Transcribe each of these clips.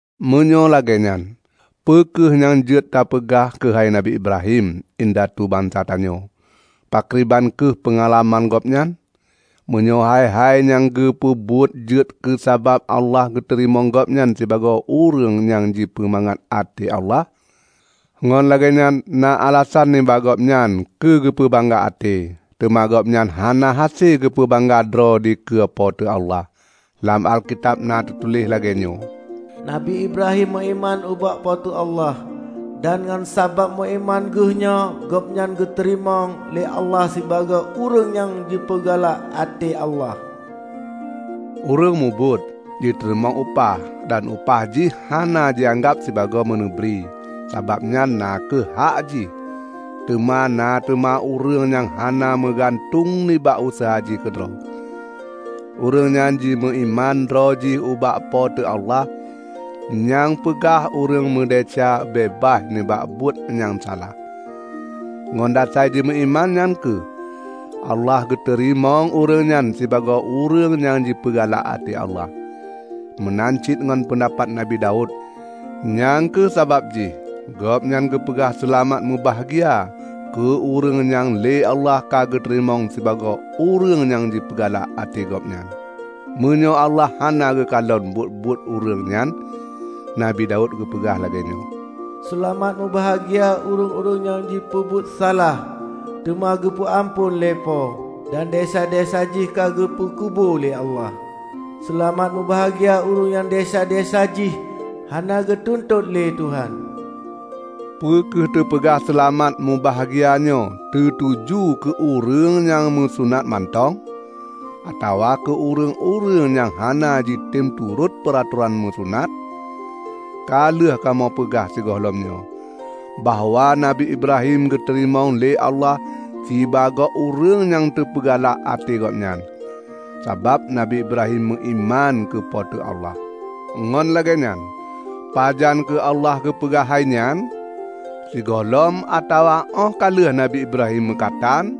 Meunyoe lagée nyan, peue kheueh nyang jeuet tapeugah keuhai Nabi Ibrahim, indatu bansa tanyoe? Pakriban kheueh peungalaman gobnyan? Meunyoe hai-hai nyang geupeubuet jeuet keusabab Allah geuteurimong gobnyan sibagoe ureuëng nyang jipeumangat até Allah, ngon lagée nyan na alasan nibak gobnyan keu geupeu bangga até. Teuma gobnyan hana hase geupeu bangga droe dikeue Po teu Allah. Lam Alkitab na teutuléh lagée nyoe, "Nabi Ibrahim meuiman ubak Po teu Allah, dan ngon sabab meuiman geuh nyoe gobnyan geuteurimong lé Allah sibagoe ureuëng nyang jipeugalak até Allah." Ureuëng mubuet, jiteurimong upah; dan upah jihnyan hana jianggab sibagoe meuneubri, sabab nyan na kheueh hak jih. Teuma na teuma ureuëng nyang hana meugantueng nibak useuha jih keudroe; ureuëng nyan jimeuiman droe jih ubak Po teu Allah nyang peugah ureuëng meudesya beubaih nibak buet nyang salah. Ngon dasai jimeuiman nyan kheueh Allah geuteurimong ureuëng nyan sibagoe ureuëng nyang jipeugalak até Allah. Meunan cit ngon peundapat Nabi Daud; nyang kheueh sabab jih gobnyan geupeugah seulamat meubahgia keu ureuëng nyang lé Allah ka geuteurimong sibagoe ureuëng nyang jipeugalak até Gobnyan, meunyoe Allah hana geukalon buet-buet ureuëng nyan. Nabi Daud geupeugah lagée nyoe, "Seulamat mubahgia ureuëng nyang jipeubuet salah teuma geupeu amphon lé Po dan desya-desya jih ka geupeu kubu lé Allah! Seulamat mubahgia ureuëng nyang desya-desya jih hana geutuntot lé Tuhan!" Peu kheueh teupeugah seulamat mubahgia nyoe teutuju keu ureuëng nyang meusunat mantong? Atawa keu ureuëng-ureuëng nyang hana jitem turot peuratoran meusunat? Ka lheueh kamoe peugah sigohlom nyoe, bahwa Nabi Ibrahim geuteurimong lé Allah sibagoe ureuëng nyang teupeugalak até Gobnyan, sabab Nabi Ibrahim meuiman keu Po teu Allah. Ngon lagée nyan, pajan kheueh Allah geupeugah hai nyan? Sigohlom atawa óh ka lheueh Nabi Ibrahim meukatan?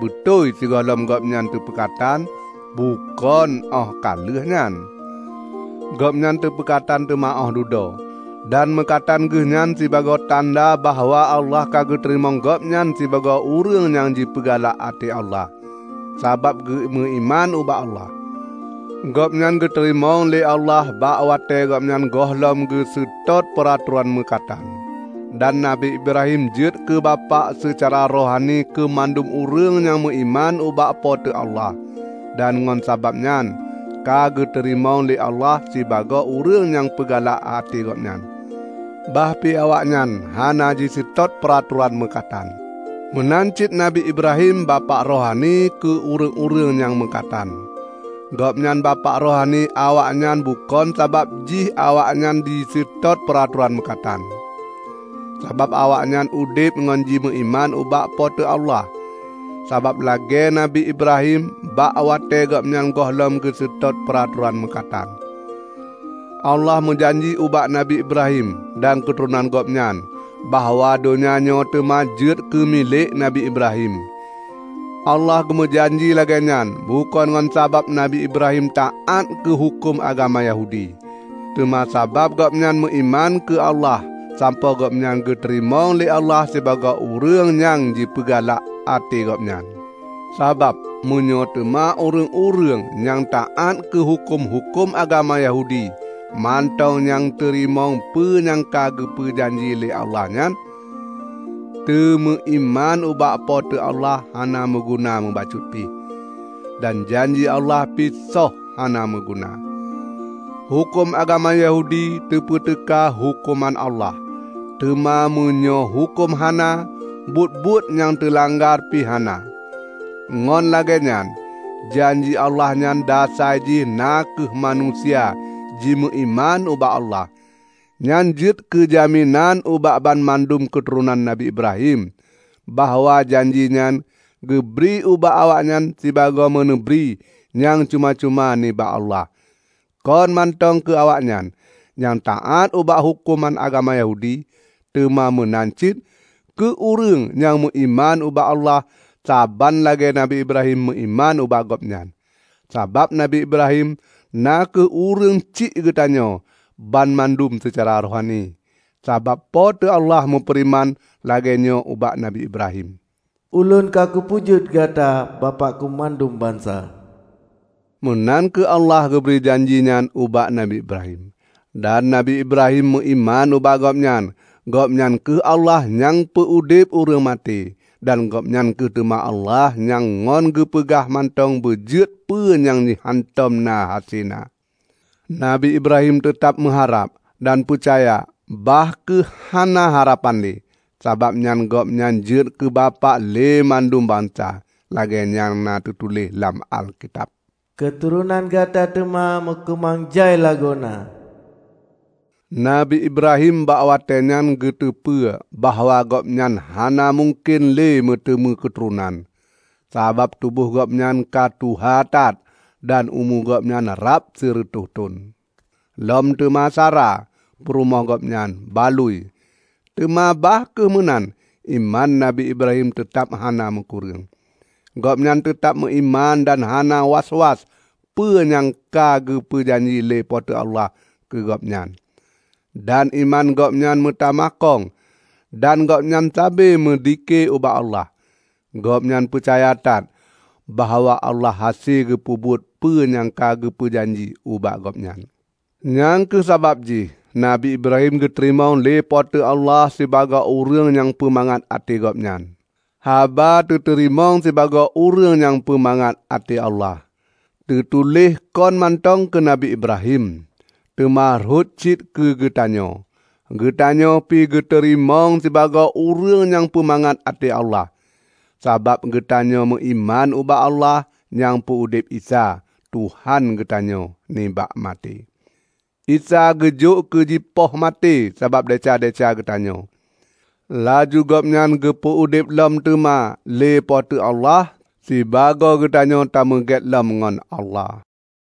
Beutôi sigohlom gobnyan teupeukatan, bukon óh ka lheueh nyan. Gobnyan teupeukatan teuma óh dudoe, dan meukatan geuh nyan sibagoe tanda bahwa Allah ka geuteurimong gobnyan sibagoe ureuëng nyang jipeugalak até Allah, sabab geumeuiman ubak Allah. Gobnyan geuteurimong lé Allah bak watée gobnyan gohlom geuseutôt peuratoran meukatan. Dan Nabi Ibrahim jeuet keu bapak seucara rohani keu mandum ureuëng nyang meuiman ubak Po teu Allah, dan ngon sabab nyan ka geuteurimong lé Allah sibagoe ureuëng nyang peugalak até Gobnyan, bah pi awaknyan hana jiseutôt peuratoran meukatan. Meunan cit Nabi Ibrahim bapak rohani keu ureuëng-ureuëng nyang meukatan. Gobnyan bapak rohani awaknyan bukon sabab jih awaknyan jiseutôt peuratoran meukatan, sabab awaknyan udeb ngon jimeuiman ubak Po teu Allah, saban lagée Nabi Ibrahim bak watée gobnyan gohlom geuseutôt peuratoran meukatan. Allah meujanji ubak Nabi Ibrahim dan keuturonan gobnyan bahwa donya nyoe teuma jeuet keu milék Nabi Ibrahim. Allah geumeujanji lagée nyan bukon ngon sabab Nabi Ibrahim taát keu huköm agama Yahudi, teuma sabab gobnyan meuiman keu Allah sampoe gobnyan geuteurimong lé Allah sibagoe ureuëng nyang jipeugalak até Gobnyan. Sabab meunyoe teuma ureuëng-ureuëng nyang taát keu huköm-huköm agama Yahudi mantong nyang teurimong peue nyang ka geupeu janji lé Allah nyan, teumeuiman ubak Po teu Allah hana meuguna mubacut pih, dan janji Allah pi soh hana meuguna. Huköm agama Yahudi teupeuteuka huköman Allah. Teuma meunyoe huköm hana, buet-buet nyang teulanggar pi hana. Ngon lagée nyan janji Allah nyan dasai jih na kheueh manusia jimeuiman ubak Allah. Nyan jeuet keujaminan ubak banmandum keuturonan Nabi Ibrahim bahwa janjinyan geubri ubak awaknyan sibagoe meuneubri nyang cuma-cuma nibak Allah; kon mantong keu awaknyan nyang taát ubak huköm agama Yahudi, teuma meunan cit keu ureuëng nyang meuiman ubak Allah saban lagée Nabi Ibrahim meuiman ubak Gobnyan. Sabab Nabi Ibrahim na kheueh ureuëng syiek geutanyoe banmandum seucara rohani. Sabab Po teu Allah meufeureuman lagée nyoe ubak Nabi Ibrahim, "Ulôn ka kupeujeuet gata bapak keumandum bansa." Meunan kheueh Allah geubri janji nyan ubak Nabi Ibrahim. Dan Nabi Ibrahim meuiman ubak Gobnyan. Gobnyan kheueh Allah nyang peu-udeb ureuëng maté; dan Gobnyan kheueh teuma Allah nyang ngon geupeugah mantong beujeuet peue nyang hántom na hase na. Nabi Ibrahim teutab meuharab dan peucaya bah kheueh hana harapan lé. Sabab nyan gobnyan jeuet keu bapak lé mandum bansa. Lagée nyang na teutuléh lam Alkitab, "Keuturonan gata teuma meukeumang jai lagoena." Nabi Ibrahim bak watée nyan geuteupeue bahwa gobnyan hana mungken le meuteumé keuturonan, sabab tuboh gobnyan ka tuha that dan umu gobnyan rab sireutôh thon; lom teuma Sara, peurumoh gobnyan, balui. Teuma bah kheueh meunan iman Nabi Ibrahim teutab hana meukureueng. Gobnyan teutab meuiman dan hana was-was peue nyang ka geupeu janji lé Po teu Allah keu gobnyan. Dan iman gobnyan meutamah kong dan gobnyan sabe meudhike ubak Allah. Gobnyan peucaya that bahwa Allah hase geupeubuet peue nyang ka geupeu janji ubak gobnyan. Nyang kheueh sabab jih Nabi Ibrahim geuteurimong lé Po teu Allah sibagoe ureuëng nyang peumangat até Gobnyan. Haba "teuteurimong sibagoe ureuëng nyang peumangat até Allah" teutuléh kon mantong keu Nabi Ibrahim, teuma rhot cit keugeutanyoe. Geutanyoe pi geuteurimong sibagoe ureuëng nyang peumangat até Allah, sabab geutanyoe meuiman ubak Allah nyang peu-udeb Isa, Tuhan geutanyoe, nibak maté. Isa ka geujok keu jipoh maté sabab desya-desya geutanyoe; laju Gobnyan geupeu udeb lom teuma lé Po teu Allah sibagoe geutanyoe tameugét lom ngon Allah.